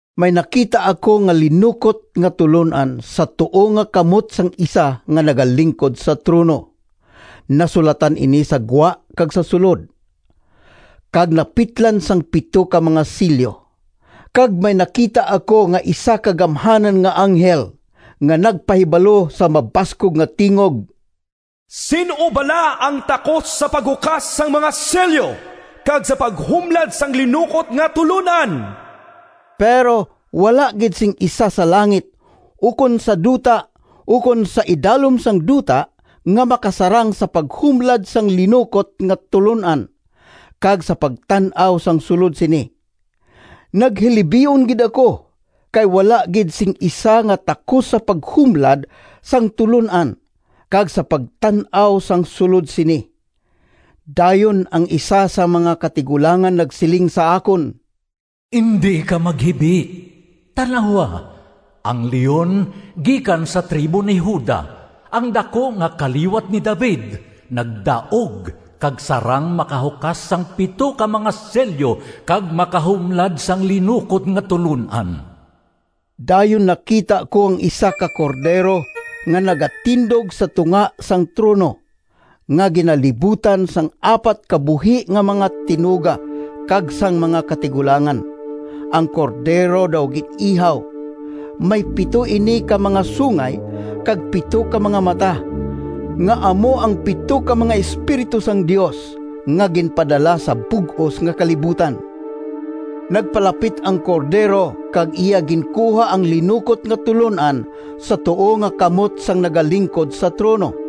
May nakita ako nga linukot nga tulon-an sa tuo nga kamot sang isa nga nagalingkod sa trono. Nasulatan ini sa gwa kag sa sulod, kag napitlan sang pito ka mga selyo. Kag may nakita ako nga isa ka gamhanan nga anghel nga nagpahibalo sa mabaskog nga tingog, “Sin-o bala ang takos sa paghukas sang mga selyo kag sa paghumlad sang linukot nga tulon-an?” Pero wala gid sing isa sa langit, ukon sa duta, ukon sa idalom sang duta, nga makasarang sa paghumlad sang linukot nga tulon-an kag sa pagtan-aw sang sulod sini. Naghilibion gid ako, kay wala gid sing isa nga takos sa paghumlad sang tulon-an, kag sa pagtan-aw sang sulod sini. Dayon ang isa sang mga katigulangan nagsiling sa akon, “Indi ka maghibi. Tan-awa! Ang Leon gikan sa tribo ni Juda, ang daku nga kaliwat ni David, nagdaog kag sarang makahukas sang pito ka mga selyo kag makahumlad sang linukot nga tulon-an.” Dayon nakita ko ang isa ka Cordero nga nagatindog sa tunga sang trono, nga ginalibutan sang apat ka buhi nga mga tinuga kag sang mga katigulangan. Ang Cordero daw gin-ihaw. May pito ini ka mga sungay kag pito ka mga mata, nga amo ang pito ka mga espiritu sang Dios nga ginpadala sa bug-os nga kalibutan. Nagpalapit ang Cordero kag iya ginkuha ang linukot nga tulon-an sa tuo nga kamot sang nagalingkod sa trono.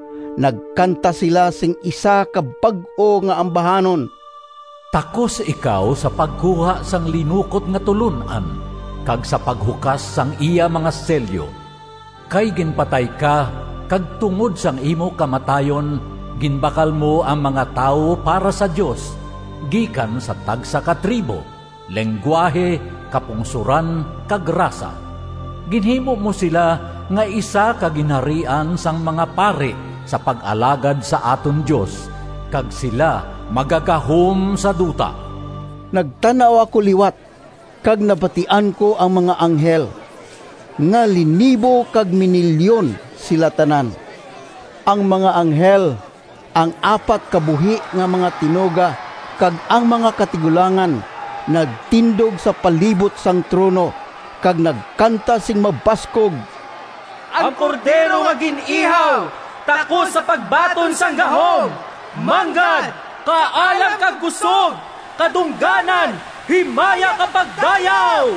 Nagkanta sila sing isa ka bag-o nga ambahanon: “Takos ikaw sa pagkuha Sang linukot nga tulon-an Kag sa paghukas sang iya mga selyo. Kay ginpatay ka, Kag tungod sang imo kamatayon Ginbakal mo Ang mga tawo para sa Dios, Gikan sa tagsa ka tribo, Linggwahe, kapungsoran, kag rasa. Ginhimo mo sila Nga isa ka ginharian sang mga pari Sa pag-alagad sa aton Dios, Kag sila magagahom sa duta.” Nagtan-aw ako liwat, kag nabatian ko ang mga anghel, nga linibo kag minilyon sila tanan. Ang mga anghel, ang apat ka buhi nga mga tinuga, kag ang mga katigulangan, nagtindog sa palibot sang trono, kag nagkanta sing mabaskog: “Ang Cordero nga gin-ihaw Takos sa pagbaton sang gahom, Manggad, kaalam, kag kusog, Kadungganan, himaya kag pagdayaw!”